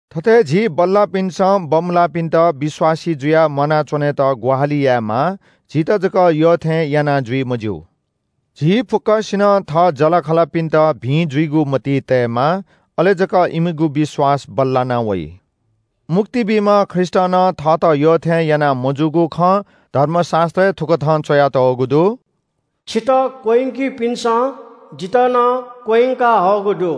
थथे झी बल्‍लाःपिन्‍सं बमलाःपिन्‍त विश्‍वासी जुयाः म्‍वानाच्‍वनेत ग्‍वाहालि यायेमाः, झीत जक यःथें याना जुइ मज्‍यू। झी फुक्‍कसिनं थः जःलाखःलापिन्‍त भिं जुइगु मतिइ तयेमाः, अले जक इमिगु विश्‍वास बल्‍लानावइ। मुक्ति बीम्‍ह ख्रीष्‍टं नं थःत यःथें याना मजूगु खँ धर्मशास्‍त्रय् थुकथं च्‍वयातःगु दु – “छितः क्‍वह्यंकिपिन्‍सं जितः नं क्‍वह्यंकाहःगु दु।”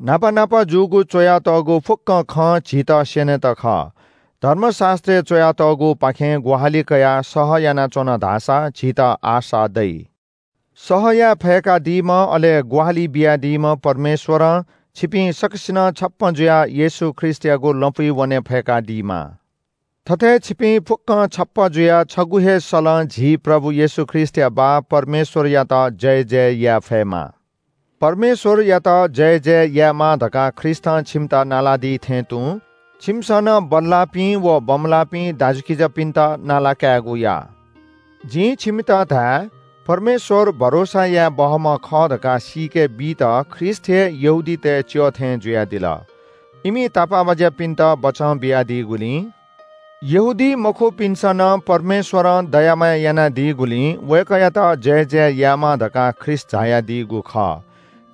न्‍हापा न्‍हापा जूगु च्‍वयातःगु फुक्‍क खँ झीत स्‍यनेत खः। धर्मशास्‍त्रय् च्‍वयातःगुपाखें ग्‍वाहालि कयाः सह यानाच्‍वन धाःसा झीत आशा दइ। सह याये फय्‌कादीम्‍ह अले ग्‍वाहालि बियादीम्‍ह परमेश्‍वरं छिपिं सकसिनं छप्‍पँ जुयाः येशू ख्रीष्‍टयागु लँपुइ वने फय्‌कादीमा। थथे छिपिं फुक्‍कं छप्‍पँ जुयाः छगू हे सलं झी प्रभु येशू ख्रीष्‍टया बाः परमेश्‍वरयात जयजय याये फयेमा। परमेश्‍वरयात जयजय यायेमा धकाः ख्रीष्‍टं छिमित नालादी थें तुं छिमिसं नं बल्‍लाःपिं व बमलाःपिं दाजुकिजापिन्‍त नाला कायेगु या। जिं छिमित धाये – परमेश्‍वर भरोसा याये बहःम्‍ह खः धकाः सीके बीत ख्रीष्‍ट हे यहूदीतय् च्‍यः थें जुयादिल। इमि तापाःबाज्‍यापिन्‍त बचं बियादीगुलिं यहूदीमखुपिन्‍सं नं परमेश्‍वरं दया माया यानादीगुलिं वय्‌कःयात जयजय यायेमा धकाः ख्रीष्‍ट झायादीगु खः।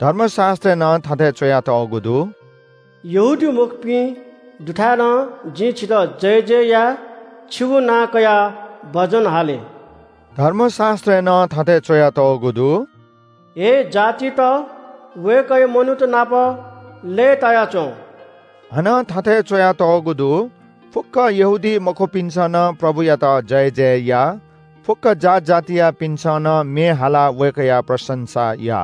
धर्मशास्‍त्रय् नं थथे च्‍वयातःगु दु – “यहूदीमखुपिं दुथाय् नं जिं छितः जयजय याये छिगु नां कयाः भजन हाले।” धर्मशास्‍त्रय् नं थथे च्‍वयातःगु दु – “हे जातित! वय्‌कःया मनूत नाप लय्‌ताया च्‍वँ।” हानं थथे च्‍वयातःगु दु – फुक्‍क यहूदीमखुपिन्‍सं नं प्रभुयात जयजय या। फुक्‍क जात जातियापिन्‍सं नं म्‍ये हालाः वय्‌कःया प्रशंसा या!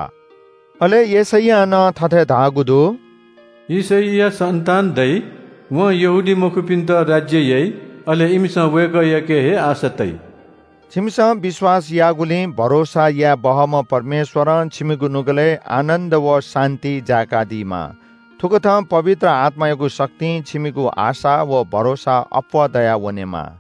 अले यशैयां नं थथे धाःगु दु – “यिशैया सन्‍तान दइ, वं यहूदीमखुपिन्‍त राज्‍य याइ। अले इमिसं वय्‌कःयाके हे आशा तइ।” छिमिसं विश्‍वास याःगुलिं भरोसा याये बहःम्‍ह परमेश्‍वरं छिमिगु नुगलय् आनन्‍द व शान्‍ति जाय्‌कादीमा। थुकथं पवित्र आत्‍मायागु शक्तिं छिमिगु आशा व भरोसा अप्‍वः दयावनेमा।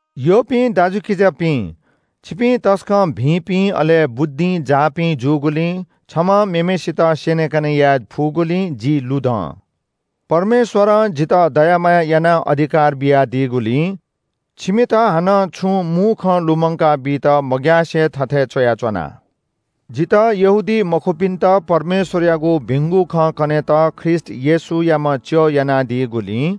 यःपिं दाजुकिजापिं, छिपिं तसकं भिंपिं अले बुद्धिं जाःपिं जूगुलिं छम्‍हं मेम्‍हय्‌सित स्‍यनेकने याये फुगुलिं जि लुधं। परमेश्‍वरं जितः दया माया यानाः अधिकार बियादीगुलिं छिमित हानं छुं मू खँ लुमंकाबीत मग्‍यासे थथे च्‍वयाच्‍वना। जितः यहूदीमखुपिन्‍त परमेश्‍वरयागु भिंगु खँ कनेत ख्रीष्‍ट येशूयाम्‍ह च्‍यः यानादीगुलिं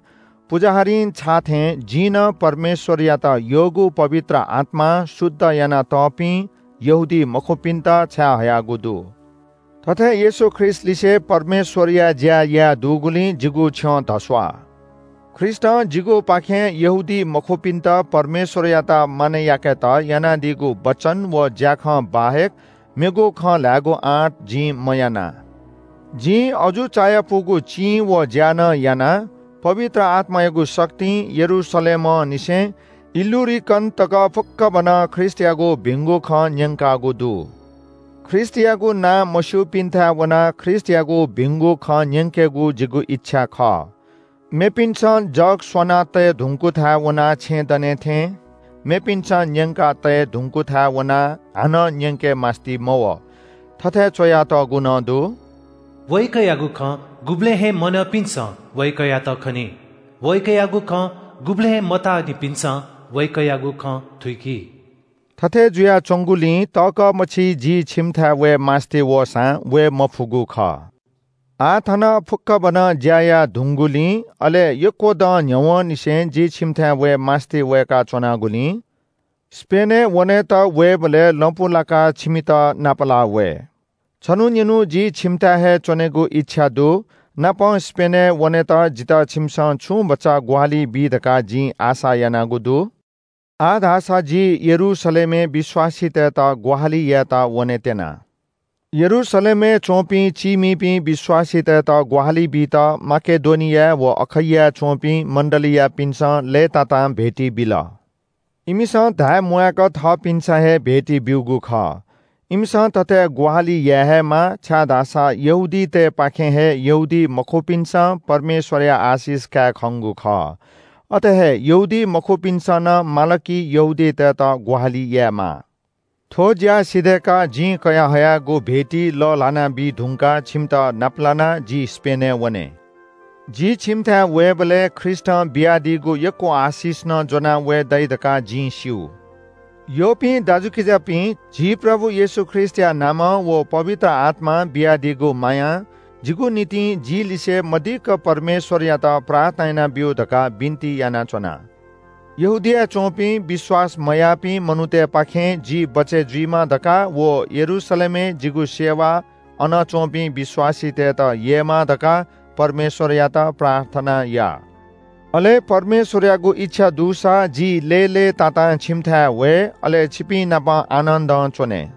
पुजाहारीं छाःथें जिं नं परमेश्‍वरयात यःगु पवित्र आत्‍मां शुद्ध यानातःपिं यहूदीमखुपिन्‍त छाये हयागु दु। थथे येशू ख्रीष्‍टलिसे परमेश्‍वरया ज्‍या याये दुगुलिं जिगु छ्यं धस्‍वाः। ख्रीष्‍टं जिगुपाखें यहूदीमखुपिन्‍त परमेश्‍वरयात मानय् याकेत यानादीगु वचन व ज्‍याखँ बाहेक मेगु खँ ल्‍हायेगु आँट जिं मयाना। जिं अजू चायापुगु चिं व ज्‍या नं याना, पवित्र आत्‍मायागु शक्तिं यरूशलेमंनिसें इल्‍लुरिकन तक फुक्‍कभनं ख्रीष्‍टयागु भिंगु खँ न्‍यंकागु दु। ख्रीष्‍टयागु नां मस्‍यूपिन्‍थाय् वनाः ख्रीष्‍टयागु भिंगु खँ न्‍यंकेगु जिगु इच्‍छा खः। मेपिन्‍सं जग स्‍वना तये धुंकूथाय् वनाः छेँ दनेथें मेपिन्‍सं न्‍यंका तये धुंकूथाय् वनाः हानं न्‍यंके मास्‍ति मवः। थथे च्‍वयातःगु नं दु – “वय्‌कःयागु खँ गुबलें हे मन्‍यनिपिन्‍सं वय्‌कःयात खनी। वय्‌कःयागु खँ गुबलें हे मताःनिपिन्‍सं वय्‌कःयागु खँ थुइकी।” थथे जुयाच्‍वंगुलिं तःकः मछि जि छिमिथाय् वये मास्‍ति वःसां वये मफुगु खः। आः थन फुक्‍कभनं ज्‍या याये धुंगूलिं, अले यक्‍व दँ न्‍ह्यवंनिसें जि छिमिथाय् वये मास्‍ति वय्‌का च्‍वनागुलिं स्‍पेनय् वनेत वयेबलय् लँपु लाकाः छिमित नापलाः वये। छन्‍हु निन्‍हु जि छिमिथाय् हे च्‍वनेगु इच्‍छा दु, नापं स्‍पेनय् वनेत जितः छिमिसं छुं भचा ग्‍वाहालि बी धकाः जिं आशा यानागु दु। आः धाःसा जि यरूशलेमय् विश्‍वासीतय्‌त ग्‍वाहालि यायेत वनेत्‍यना। यरूशलेमय् च्‍वंपिं चीमिपिं विश्‍वासीतय्‌त ग्‍वाहालि बीत माकेडोनियाय् व अखैयाय् च्‍वंपिं मण्‍डलीयापिन्‍सं लय्‌तातां भेटी बिल। इमिसं धाये म्‍वाय्‌क थःपिन्‍सं हे भेटी ब्‍यूगु खः। इमिसं थथे ग्‍वाहालि याये हे माः, छाय्‌धाःसा यहूदीतय्‌पाखें हे यहूदीमखुपिन्‍सं परमेश्‍वरया आशिष काये खंगु खः। अथे हे यहूदीमखुपिन्‍सं नं माल कि यहूदीतय्‌त ग्‍वाहालि यायेमाः। थ्‍व ज्‍या सिधय्‌काः जिं कयाः हयागु भेटी लःल्‍हाना बीधुंकाः छिमित नाप लानाः जि स्‍पेनय् वने। जि छिमिथाय् वयेबलय् ख्रीष्‍टं बियादीगु यक्‍व आशिष नं ज्‍वनाः वये दइ धकाः जिं स्‍यू। यःपिं दाजुकिजापिं, झी प्रभु येशू ख्रीष्‍टया नामं व पवित्र आत्‍मां बियादीगु मायां जिगु निंतिं जिलिसें मदिक्‍क परमेश्‍वरयात प्रार्थना यानाब्‍यु धकाः बिन्‍ति यानाच्‍वना। यहूदियाय् च्‍वंपिं विश्‍वास मयाःपिं मनूतय्‌पाखें जि बचय् जुइमा धकाः व यरूशलेमय् जिगु सेवा अन च्‍वंपिं विश्‍वासीतय्‌त ययेमा धकाः परमेश्‍वरयात प्रार्थना या। अले परमेश्‍वरयागु इच्‍छा दुसा जि लय्‌लय्‌तातां छिमिथाय् वये, अले छिपिंनाप आनन्‍दं च्‍वने।